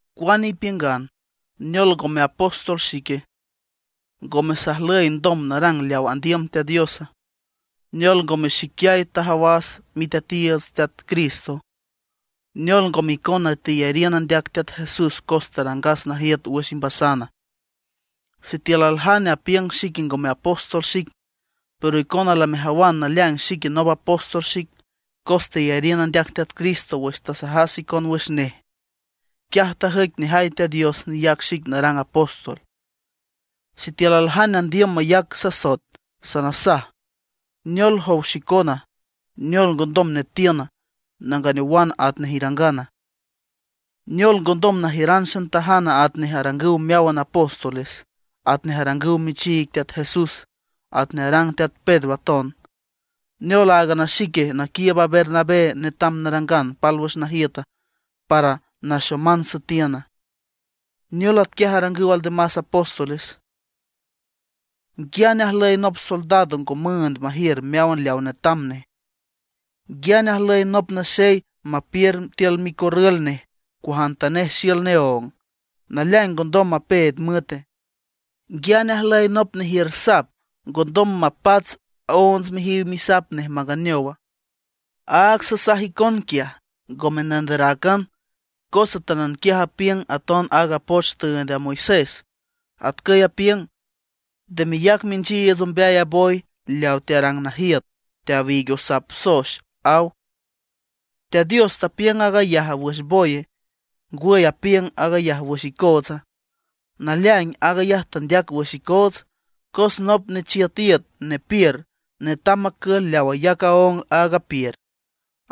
Cuane ipiüngan, ¿neol ngome apóstol xique? ¿Ngome sajlüye ndom narang leaw andiüm Teat Diosa? ¿Neol ngome xiquiay tajawas Miteatiiüts Teat Cristo? ¿Neol ngome icona teyariün andeac Teat Jesús cos tarangas najiüt wüx imbasana? Sitiül aljane apiüng xique ngome apóstol xic, pero icona lamejawan naleaing xique nop apóstol xic, cos teyariün andeac Teat Cristo wüx tasajas icon wüx nej. Quiaj tajüic nejay Teat Dios neyac xic narang apóstol. Sitiül aljane andiüm mayac sasoet, sanasaj: ¿Neol jow xicona, neol ngondom netiün, nanganeowan atnej irangana? ¿Neol ngondom najiüran xantajana atnej arangüw meáwan apóstoles, atnej arangüw michiig Teat Jesús, atnej arang Teat Pedro aton? ¿Neol áagan a xique naquiiüb a Bernabé netam narangan pálwüx najiüt para naxoman süetiüna? ¿Neol atquiaj arangüw aldemas apóstoles? ¿Nguiane ajlüy nop soldado ngo müünd majiür meáwan leaw netam neje? ¿Nguiane ajlüy nop naxey mapiür tiül micorrül nej cuajantanej xiül neóng, naleaing ngondom mapeed müete? ¿Nguiane ajlüy nop nejiür sap, ngondom mapats onts mijiw misap nej manganeowa? Áag sasaj icon quiaj ngome nanderacan cos atánan quiaj apiüng aton aaga poch tüünd a Moisés. Atcüy apiüng: “Nde meyac minchiiüts ombeay a boy leaw tearang najiüt teawiig osaab soex”, aw. ¿Teat Dios tapiüng aag ayaja wǘxan boye; ngwüy, apiüng aag ayaj wüx icootsa? Naleaing, aag ayaj tandeac wüx icoots. Cos nop nechiüt iüt, nepiür, netam macül leaw ayac aóng aag apiür.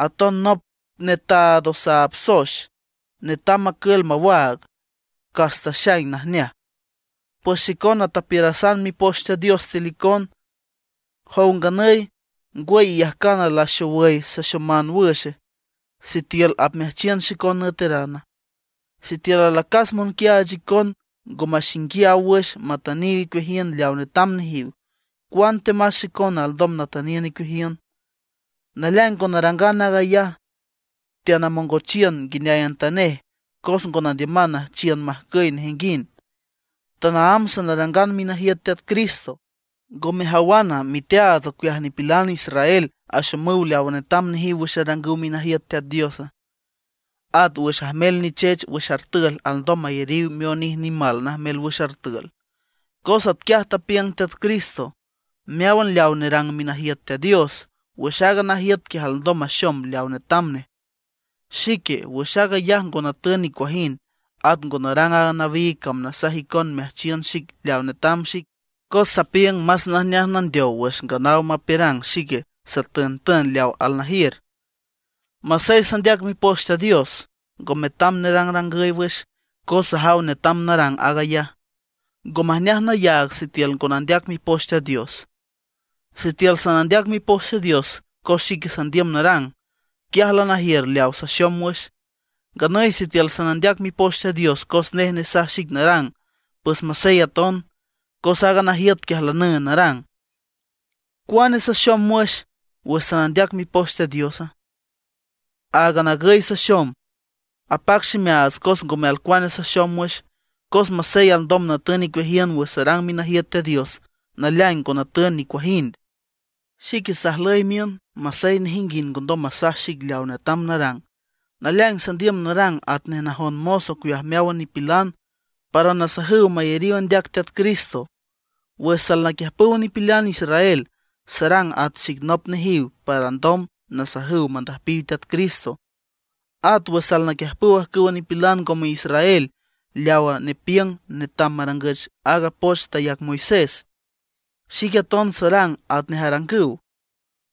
Aton nop netaad osaab soex netam macül mawaag, cas taxaing najneaj. Pues xicona tapiürasan Mipoch Teat Dios tiül icon. ¿Jow nganüy, ngwüy iyajcana laxowüy saxoman wüxe, sitiül apmeajchiün xicon nüeterana? Sitiül alacas monquiaach icon ngo maxinguiaw wüx matüniw icueajiün leaw netam nejiw, cuantemas xicona alndom natüniün icueajiün. Naleaing ngo narangan aag ayaj. Teanamongochiün nguineayantanej cos ngo nandiüman nüjchiün majcüy nejinguind. Tanaámb sanarangan minajiüt Teat Cristo. ¿Ngo mejawana, miteaats ocueaj nipilan israel axomüw leawa netam nejiw wüx arangüw minajiüt Teat Dios? At wüx ajmel nichech wüx artül alndom mayariw mionij nimal najmel wüx artül. Cos atquiay tapiüng Teat Cristo: Meáwan leaw nerang minajiüt Teat Dios, wüx aaga najiüt quiaj alndom maxom leawa netam nej. Xique, wüx aag ayaj ngo natün nicuajind. At ngo narang aaga nawiig cam nasaj icon meajchiün xic leaw netam xic. Cos sapiüng más najneaj nandeow wüx nganaw mapiürang xique satüntün leaw alnajiür. Masey sandeac Mipoch Teat Dios, ngo metam nerangrangüy wüx, cos sajaw netam narang aag ayaj. ¡Ngo majneaj nayaag sitiül ngo nandeac Mipoch Teat Dios! Sitiül sanandeac Mipoch Teat Dios cos xique sandiüm narang, quiaj lanajiür leaw saxom wüx. Nganüy sitiül sanandeac Mipoch Teat Dios cos nej nesaj xic narang, pues masey aton, cos aaga najiüt quiaj lanüünd narang. ¿Cuane saxom wüx, wüx sanandeac Mipoch Teat Diosa? Áagan agüy saxom: Apac ximeaats cos ngome alcuane saxom wüx. Cos masey alndom natün icueajiün wüx sarang minajiüt Teat Dios, naleaing ngo natün nicuajind. Xique sajlüy miün, masey nejinguind ngondom masaj xic leaw netam narang; naleaing sandiüm narang atnej najon mos ocueaj meáwan nipilan, para nasajüw mayariw andeac Teat Cristo. Wüx salnaquiüjpüw nipilan israel, sarang at xic nop nejiw para alndom nasajüw mandüjpiw Teat Cristo. At wüx alnaquiüjpüw ajcüwa nipilan ngome israel leaw nepiüng netam marangüch aaga poch tayac Moisés, xique aton sarang atnej arangüw,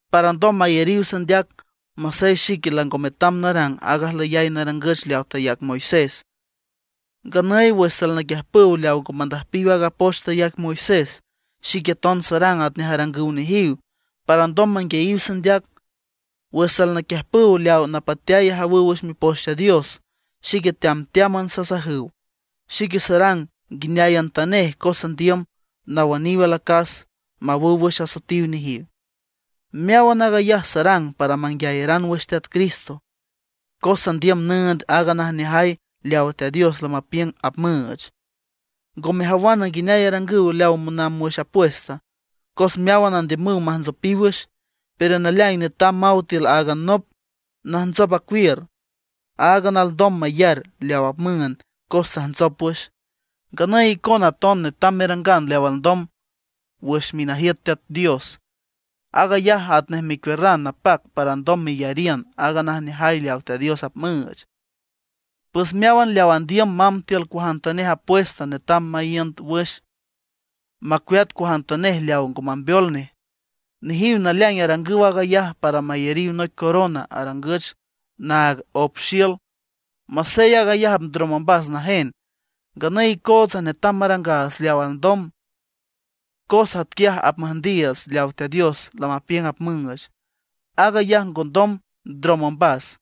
para alndom mayariw sandeac, masey xique lango metam narang aaga ajlüyay narangüch leawa tayac Moisés. Nganüy wüx salnaquiüjpüw leaw ngo mandüjpiw aaga poch tayac Moisés, xique aton sarang atnej arangüw nejiw, para alndom manguiayiw sandeac. Wüx salnaquiüjpüw leaw napateay ajawüw wüx Mipoch Teat Dios, xique teamteáman sasajüw. Xique sarang nguineayantanej cos sandiüm nawüniw alacas, mawüw wüx asoetiw nejiw. Meáwan aag ayaj sarang para manguiayaran wüx Teat Cristo, cos sandiüm nüünd aaga najneajay leawa Teat Dios lamapiüng apmüüch. ¿Ngo mejawana nguineay arangüw leaw monamb wüx apuesta? Cos meáwan andiümüw majntsopiw wüx, pero naleaing netam maw tiül áagan nop najntsop acuiür. Áagan nop alndom mayar leaw apmüünd cos tajntsop wüx. Nganüy icona aton netam merangan leaw alndom wüx minajiüt Teat Dios, aag ayaj atnej mecuiürran napac para alndom meyariün aaga najneajay leaw Teat Dios apmüüch. Pues meáwan leaw andiüm mamb tiül cuajantanej apuesta netam maíünd wüx, macueat cuajantanej leaw ngo mambeol nej. Nejiw naleaing arangüw aag ayaj para mayariw noic corona arangüch naag op xiül, masey aag ayaj apndrom ombas najen. Nganüy icootsa netam marangaats leaw alndom, cos atquiaj apmüjndiiüts leaw Teat Dios lamapiüng apmüüch. Aag ayaj ngondom ndrom ombas.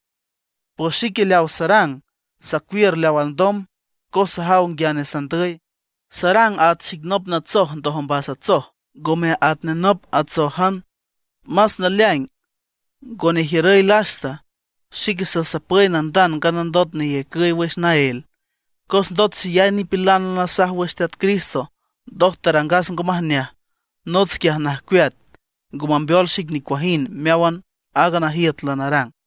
Pues xique leaw sarang, sacuiür leaw alndom, cos sajaw nguiane sandüy. Sarang at xic nop natsoj ndoj ombas atsoj, ngome atnej nop atsójan. Más naleaing, ngo nejiürüy lasta, xique sasapüy nandand nganandot neyacüy wüx naél. Cos ndot xeyay nipilan lanasaj wüx Teat Cristo, ndoj tarangas ngo majneaj, nots quiaj najcueat, ngo mambeol xic nicuajind meáwan aaga najiüt lanarang.